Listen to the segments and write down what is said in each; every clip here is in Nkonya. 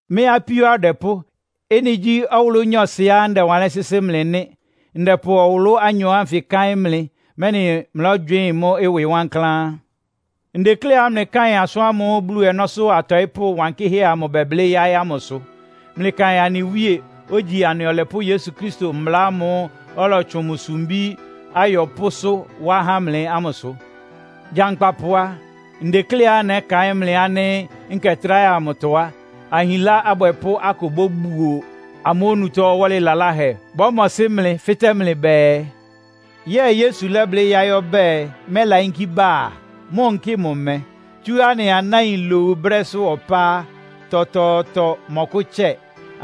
Mɩ́ apíó adwɛpʋ́, ɩ́nɩ gyí ɔwʋlʋ́ nyɔɔsɩá ndɛwanlɩ́n sɩ́sɩ́ mlɩ nɩ́. Ndɛpʋ nwʋlʋ́ anyɔ ánfɩ káɩ́n mlɩ, mɛ́nɩ mlɔ́gywɩɩ́n mʋ́ ɩwɩ wankláán. Ndekléá mlɩkáɩn asʋ́n ámʋ́ʋ́ Bulu ɔnɔ́sʋ́ atɔɩ́pʋ́ wankɩ́hɛ́ amʋ bɛblɩ́ yáɩ́ ámʋsʋ. Mlɩkaɩn anɩ Wíe, ogyi anɩ Ɔlɛpʋ́ Yesu Kristo mbla ámʋ́ʋ́ ɔlɔtsʋn mʋ sumbí ayɔpʋ́sʋ́ wá há mlɩ ámʋsʋ. Gyankpapʋ a, ndekléá nɛ́kaɩ́n mlɩ ánɩ́ nkɛ tráhɛ amʋtɔ á, ahinlá abwɛpʋ́ akʋ bóbuo amʋ́ onutó ɔwɔ́lɩ laláhɛ. Bɔ́mɔsɩ́ mlɩ, fɩ́tɛ́ mlɩ bɛɛ, “Yɛ́ɛ Yesu lɛ́blɩ́ yáɩ́ ɔbɛ́ɛ, mɛ́layínkí bá a? Mʋ́ nkɩ mʋ mɛ́? Tsú anɩ anáin lowu brɛ́sʋ́ ɔpá á, tɔtɔɔtɔ mɔ́kʋ́tsɛ.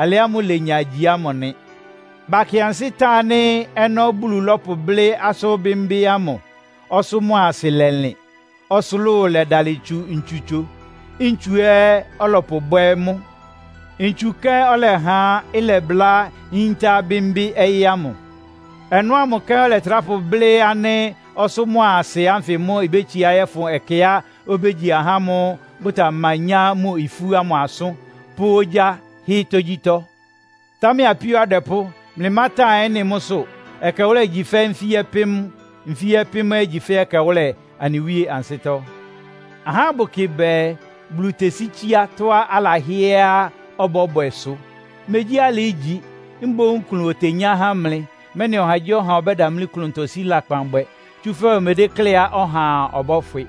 Alɩ ámʋ́ʋ́ ilenya igyi ámʋ nɩ.” Bakɩ ansɩ́ tan ánɩ́ ɔnɔ́ Bulu lɔ́pʋblɩ́ asʋ́n bɩ́mbɩ́ ámʋ, ɔsʋ́ mʋ́a asɩ lɛlɩn, ɔsʋlʋ́ʋ lɛdalɩ tsu ntsutso. Ntsu ɛ́ ɔlɔpʋbwɛ́ mʋ́. Ntsu kɛ́n ɔlɛha ɩlɔbʋlá yíntá bɩ́mbɩ́ ɔyɩ́ ámʋ. Ɔnɔ́ ámʋ kɛ́n ɔlɛtrá pʋblɩ́ ánɩ́ ɔsʋ́ mʋ́a asɩ ánfɩ mʋ́ ibétsiá yɔ́fʋn ɛkɛá obégyi ahá ámʋ́ʋ́ bʋtamanyá mʋ ifú ámʋ asʋ́n, pʋ́ ogyá hɩ́ tógyítɔ́. Támɛ apíó adwɛpʋ́, mlɩmátan ɩ́nɩ mʋ́sʋ́. Ɛkɛwʋ́lɛ igyi fɛ́ nfí-ɔpɩ́m, nfí-ɔpɩ́m ɛ́ igyi fɛ́ ɛkɛwʋ́lɛ anɩ Wíe ansɩ́tɔ́. Ahá bʋkɩ bɛɛ, Bulu tesi tsiá tɔ́á alahɩ́ɛ́á ɔbɔ́bwɛsʋ. Megyí alɩ ígyi, mboún klʋn otenyá há mlɩ; mɛ́nɩ ɔhagyíɔha ɔbɛ́damlí klʋntɔ sí lakpan bwɛ, tsúfɛ́ omedékléá ɔhaa ɔbɔ́fwɩ.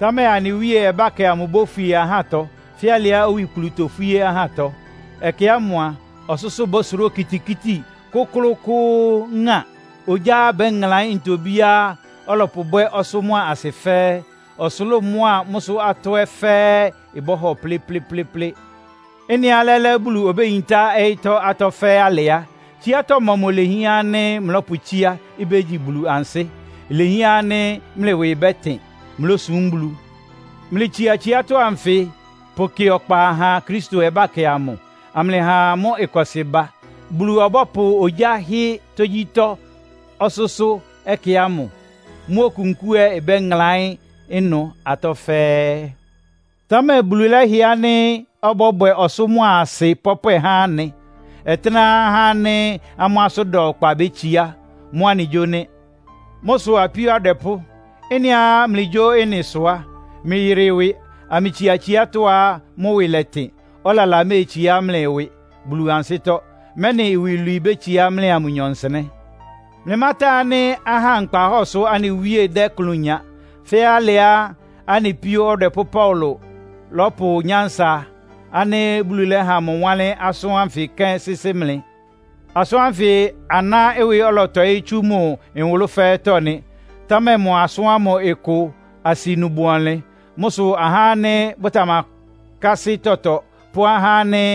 Támɛ anɩ Wíe ɔbákɛ amʋ ibófwie ahátɔ, fɛ́ alɩá owikplu tofwíé ɔhatɔ. Ɛkɛ ámʋ a, ɔsʋ́sʋ́ bɔ́sʋrá okitikíti kʋ́klʋ́klʋ́ʋ́ ŋa. Ogyá bɛ́ŋlaɩ́n ntobíá ɔlɔpʋbwɛ́ ɔsʋ́ mʋ́a asɩ fɛ́ɛ́. Ɔsʋlʋ́ʋ mʋ́a mʋ́sʋ́ atɔ́ ɛ́ fɛ́ɛ́ bɔ́hɔ plɩ́plɩ́plɩ́plɩ́. Ɩ́nɩá lɛ́lɛ́ Bulu obéyintá ɔyɩ́tɔ́ atɔ́ fɛ́ɛ́ alɩ á, tsiátɔ́ mɔmʋ ilehián ánɩ́ mlɔ́pʋtsíá, ibégyi Bulu ansɩ́? Ilehián ánɩ́ mlɩ ɩwɩ bɛ́tɩn, mlósúm Bulu. Mlɩtsia tsiátɔ́ anfɩ pʋkɩ ɔkpa ha Kristo ɔbákɛ amʋ, amlɩha mʋ́ ɩkɔsɩ ba. Bulu ɔbɔ́pʋ ogyá hɩ́ tógyítɔ́ ɔsʋ́sʋ́ ɛkɛ ámʋ. Mʋ́ okunkúu ɛ́ ɩbɛ́ŋlaɩ́n ɩnʋ atɔ́ fɛ́ɛ́. Támɛ Bulu lɛ́hɩɛ ánɩ́ ɔbɔ́bwɛ ɔsʋ́ mʋ́a asɩ pɔpwɛ há anɩ. Ɔtɩ́nɛ́á ahá ánɩ́ amʋ́ asʋ́n da ɔkpa bétsiá. Mʋ́ anɩgyó nɩ́. Mʋ́ sʋ apíó adwɛpʋ́, ɩ́nɩá mlɩgyó ɩ́nɩ sʋ á, mlɩyɩrɩ ɩwɩ amlɩtsia tsiátɔ́á mʋ́ ɩwɩ lɛtɩn, ɔlala méetsiá mlɩ ɩwɩ Bulu ansɩ́tɔ́, mɛ́nɩ iwilwii bétsiá mlɩa mʋnyɔ nsɩnɛ́. Mlɩmátan ánɩ́ ahá nkpahɔ́ɔ sʋ́ anɩ Wíe dɛ́ ɩklʋn nya, fɛ́ alɩá anɩ píó ɔdwɛpʋ́ Paulo lɔ́pʋ nyánsa ánɩ́ Bulu lɛ́ha mʋ wánlɩ́n asʋ́n ánfɩ kɛ́n sɩ́sɩ́ mlɩ. Asʋ́n ánfɩ aná ɩwɩ ɔlɔtɔɩ́ tsú mʋ nwʋlʋ́ fɛ́ɛ́tɔ́ nɩ. Támɛ mʋ asʋ́n ámʋ ɩkʋ asɩnu bʋ ɔnlɩn. Mʋ́ sʋ ahá ánɩ́ bʋtamakásɩ́ tɔtɔ pʋ́ ahá ánɩ́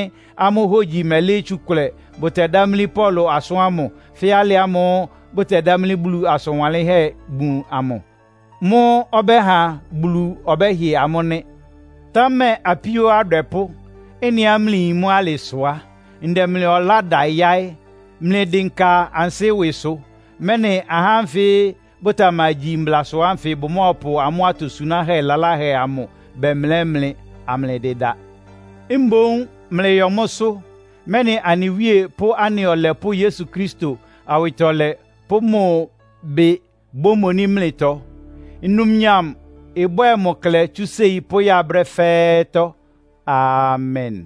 amʋ́ hogyi mɛlɩ́ɩ́ tsukʋlɛ bʋtɛdámlí Paulo asʋ́n ámʋ, fɛ́ alɩ ámʋ́ʋ́ bʋtɛdámlí Bulu asʋn wanlɩ́nhɛ́ bun amʋ. Mʋ́ ɔbɛ́ha Bulu ɔbɛ́hɩ amʋ́ nɩ́. Támɛ apíó adwɛpʋ́, ɩ́nɩá mlɩyin mʋ́ alɩ sʋ á, ndɛ mlɩ ɔlá da yáɩ́. Mlɩdɩnka ansɩ́ ɩwɩsʋ, mɛ́nɩ ahá ánfɩ bʋtamagyi mblasʋ ánfɩ bʋmɔ́ɔpʋ amʋ́ atosunáhɛ́ laláhɛ amʋ bɛmlɛ́ mlɩ, amlɩdɩda. Mboún mlɩyɔ mʋ́sʋ́, mɛ́nɩ anɩ Wíe pʋ́ anɩ Ɔlɛpʋ́ Yesu Kristo awɩtɔlɛ pʋ́ mʋ bɩ bómoní mlɩtɔ. Numnyam ɩbwɛ́ɛ mʋ klɛ tsú séi pʋ́ya brɛ́ fɛ́ɛ́tɔ́! Amen.